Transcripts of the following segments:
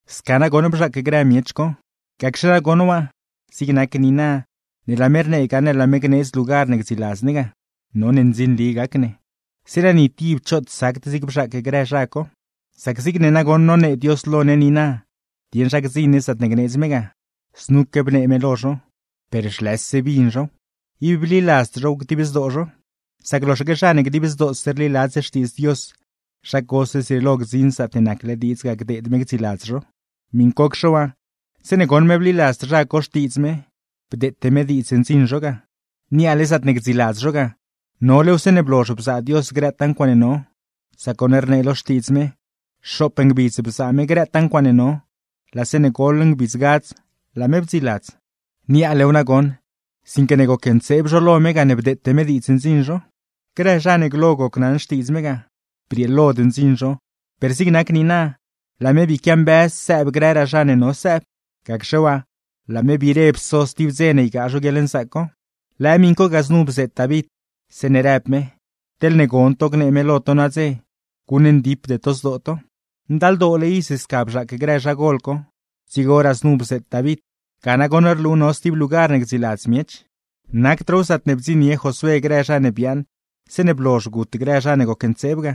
Sca nagoṉ bzhaac grë miech co. Gacxe nagoṉ waa, zig nac niina ne laa me rnee gaṉle laa me gneedz lugar ne gdziiladzgaa ne, none ndzinli gac ne, zeeṉa ni tib choot sacd zig bzhaac grë zha co. Sac zigne nagoṉ nonee Dios lo ne niina dieṉ zha gdziṉ ne zaatne gneedz me ga, znuque bnee me lo zho; per zhlëse bin zhow, ib bliladzd zhow dib zdoo zho. Sac loxaque zha ne dib zdoose rliladz xtiidz Dios, zha cose zrieelo gdziṉ zaatne nacle diidz ga gdeed me gdziiladz zho. Miṉcocxe waa, zeeṉe goṉ me bliladzd zha co xtiidz me, bdeete me diidz ndziṉ zho ga. Niaale zaatne gdziiladz zho ga, nolew zeeṉe blozh bzaa Dios grëtaa ncuaaṉe no. Sac goṉ rnee lo Xtiidz me: “Xoop ngbidz bzaa me grëtaa ncuaaṉe no, laa zeeṉe goḻ ngbidz gadz laa me bdziiladz.” Niaalew nagoṉ, sinque ne gocntseeb zho lo me gane bdeete me diidz ndziṉ zho. Grë zha ne glo gocnaṉ xtiidz me ga, brieelod ndziṉ zho; per zig nac niina, laa me bii quiambëz sëëb grëraa zha ne no sëëb. Gacxe waa, laa me biire pso stib dze ne ygaa zho guieḻnzaac co. Lëë miṉ co ga znu bzeet David, zeeṉe rëb me: “Teḻne gon to gnee me lo to nadze, guṉndipde to zdoo to.” Ndaldoole iz sca bzhaac grë zhagol co, dzigoraa znu bzeet David; ga nagoṉ rlu no stib lugar ne gdziiladz miech. Nacdraaw zaatne bdziṉnie Josué grë zha ne biaaṉ zeeṉe blozh gut grë zha ne gocntseeb ga;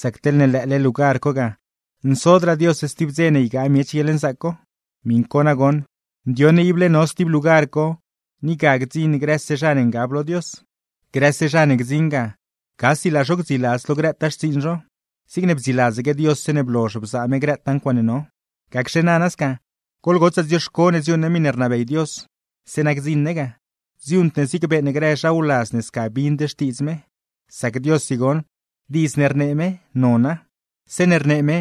sac teḻne lëële lugar co ga, nsodraa Dios stib dze ne ygaa miech guieḻnzaac co. Miṉ co nagoṉ, ndioṉ ne ible no stib lugar co, ni ga gdziṉ grëse zha ne ngab lo Dios. Grëse zha ne gdziṉ ga, gasi laa zho gdziiladz lo grëtaa xtsiiṉ zho, zigne bdziiladzaque Dios zeeṉe blozh bzaa me grëtaa ncuaaṉe no. Gacxe nana sca, goḻgotsaa dzioxco ne dziuuṉ ne miṉe rnabey Dios, zeeṉa gdziṉ ne ga; dziuuṉd ne zigne beeṉ grë zha wladz ne sca bind xtiidz me. Sac Diossi goṉ, diidz ne rnee me, nona. Zeeṉe rnee me,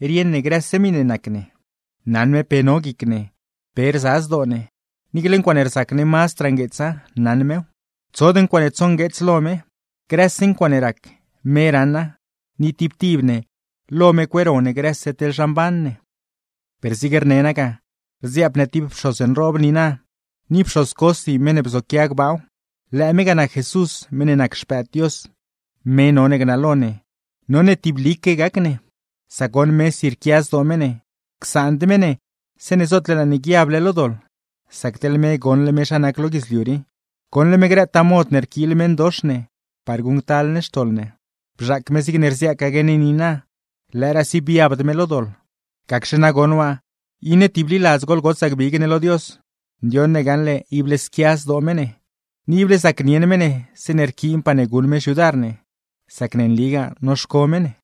rieṉ ne grëse miṉe nac ne. Naṉ me pe no guic ne, pe rza zdoo ne; niicle ncuaaṉe rzac ne mazdraa ngueetsa, naṉ mew. Tsod ncuaaṉe tsongueets lo me. Grëse ncuaaṉe rac, me raṉa; ni tib tib ne, lo me cueero ne grëse teḻ zha mban ne. Per zig rne naa ga, rdziaap ne tib pxoz nroob niina, ni pxoz cosi meṉ ne bzoquia gbaaw. Lëë me ga nac Jesús, meṉ ne nac Xpëëd Dios, me none gnalo ne; none tiblique gac ne. Sac goṉ mesi rquia zdoo me ne, csaand me ne zeeṉe zootle laa ne guiable lo doḻ, sac teḻ me goṉle me zha nac lo guidzliu rii, goṉle me grëtaa mod ne rquiil meṉdox ne par guṉctal ne xtoḻ ne. Bzhaac me zigne rziaacaque ne niina, lëëraasi biabd me lo doḻ. Gacxe nagoṉ waa, iṉe tibliladz goḻgotsaa gbig ne lo Dios, ndioṉ ne gaṉle ible squia zdoo me ne, ni ible zacnieṉ me ne zeeṉe rquiinpaa ne guṉ me xyudar ne, sac ne nligaa noxco me ne.